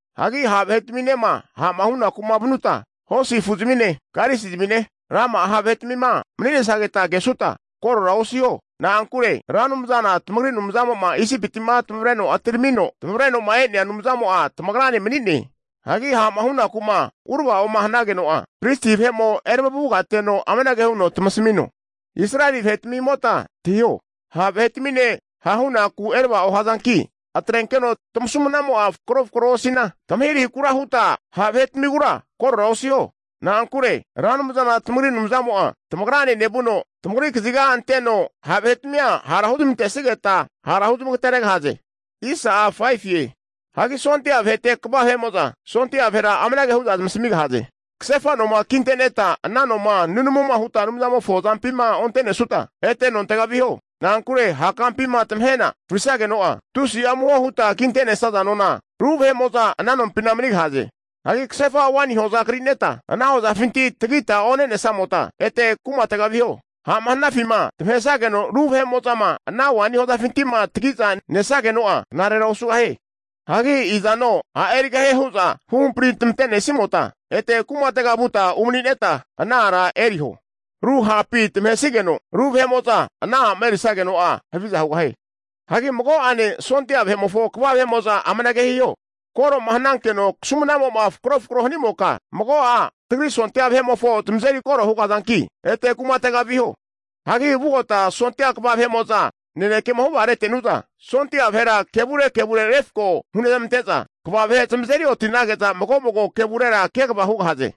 Hagi ha' vahetaminema ha'ma hunaku'ma vanuta, hosi afuzmine, karisizmine, rama'a ha' vahetamima mani'nesageta kesuta, korora osiho. Na'ankure Ra Anumzana tamagri Anumzamo'ma Isipiti'ma tamavre atiramino tamavreno'ma e'nea Anumzamo'a tamagrane mani'ne. Hagi ha'ma hunaku'ma urava'oma hanageno'a, pristi vahe'mo eramavugateno amanage huno tamasamino, Israeli vahetamimota antahiho, ha' vahetamine ha'hunaku erava'o hazanki atrenkeno tamasumnamo'a fakro fakroa osina, tamahirahikura huta ha' vahetamigura korora osiho. Na'ankure Ra Anumzana tamagri Anumzamo'a tamagrane nevuno, tamagri kaziga anteno ha' vahetmia hara huzmantesigeta hara huzmagateregahaze. Hagi sondia vahete (ofisa) kva vahe'mo'za sondia vahera amanage hu'za zamasamigahaze, kasefa noma kinte'neta ana noma nunamuma huta Anumzamofo azampima onte'nesuta, ete nontega viho. Na'ankure ha' kampima tamahena frisageno'a, tusi'a amuho huta kinte'nesaza nona, ru vahe'mo'za ana nompina manigahaze. Hagi kasefa waini hoza kri'neta, ana hozafinti tagita one'nesamota, ete kumatega viho. Ha'ma hanafima tamahesageno ru vahe'mo'zama ana waini hozatamifinti'ma tagi'za nesageno'a, knarera osugahie. Hagi izano a' erigahane hu'za huhampri' tamante'nesimota ete kumatega vuta umani'neta ana ara eriho. Ru ha'pima tamahesageno ru vahe'mo'za ana a'ma erisageno'a, haviza hugahie. Hagi mago'ane sondia vahe'mofo kva vahe'mo'za amanage hiho, koro'ma hanankeno kasumnamo'ma fakro fakroma hanimoka, mago'a tagri sondia vahetimofo zamazeri koro hugahazanki, ete kumatega viho. Hagi vugota sondia kva vahe'mo'za nanekema huvaretenu'za, sondia vahera kevure kevure refko hunezmante'za kva vahe zamazeri oti'nage'za, mago mago kevurera kegava hugahaze.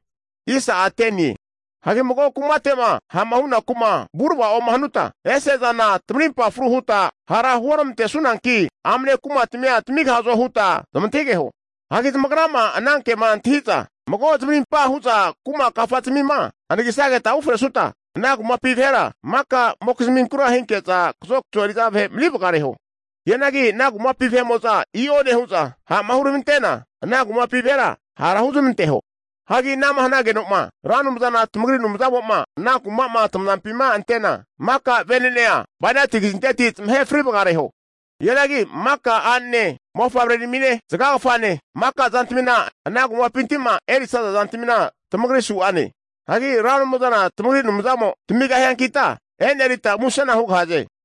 Hagi mago kumate'ma ha'ma hunaku'ma vurava'o hanuta, ese'zana tamarimpa fruge huta hara huormantesunanki amne kumatmia tamigahazo huta zamantahigeho. Hagi zamagrama ana kema antahi'za mago zamarimpa hu'za kuma kafazmima anagisageta ufresuta, ana kumapi vahera maka'mokizmigura hinke'za kazokazo eri'za vahe mani vagareho. Hianagi ana kumapi vahe'mo'zama i'o nehu'za ha'ma huramantena, ana kumapi vahera ha' huzmanteho. Hagi ana'ma hanageno'ma Ra Anumzana tamagri Anumzamo'ma ana kuma'ma tamazampima antena, maka venene'age bainati kazinteti zamahe frivagareho. Hianagi maka a'nene, mofavreramine, zagagafane, maka zantamina ana kumapinti'ma erisaza zantamina tamagri su'ane. Hagi Ra Anumzana tamagri Anumzamo tamigahiankita, e'nerita musena hugahaze.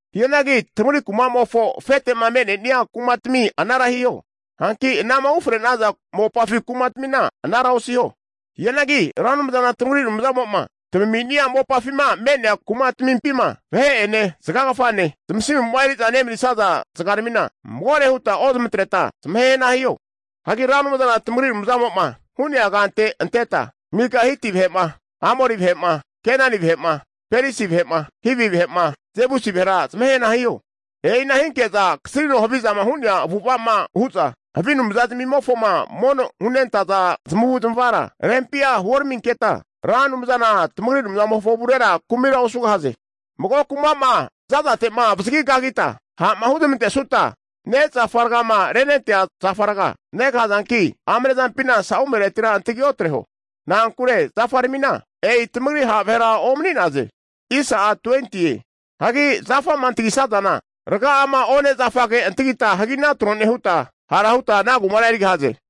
Hianagi tamagri kuma'mofo afete'ma me'nenia kumatmi anara hiho. Hanki anama ufre'naza mopafi kumatmina anara osiho. Hianagi Ra Anumzana tamagri Anumzamo'ma tamami'nia mopafima me'nea kumatamimpima vahe'ene zagagafane zmasimu'ma eri'za nemanisaza zagaramina, magore hutma ozmatreta zamahehna hiho. Hagi Ra Anumzana tamagri Anumzamo'ma hu'nea kante anteta, mika Hiti vahe'ma, Amori vahe'ma, Kenani vahe'ma, Perisi vahe'ma, Hivi vahe'ma, Jebusi vahera zamahe hana hiho. E'ina hinke'za kasrino havizama hu'nea avu'ava'ma hu'za havi anumza zmimofoma mono hunentaza zamavu'zmavara rempia huoraminketa, Ra Anumzana tamagri Anumzamofo avurera kumira osugahaze. Mago kuma'ma za'zate'ma avazagi kagita ha'ma huzmantesuta, nezafa ragama renentea zafaramina raga'a negahazanki amne zampina sa'umenura antagi otreho. Na'ankure zafaramina e'i tamagri ha' vahera omani'naze! Hagi zafama antagisazana raga'ama one' zafage antagita hagina tro nehutma, hara hutma ana kumara erigahaze.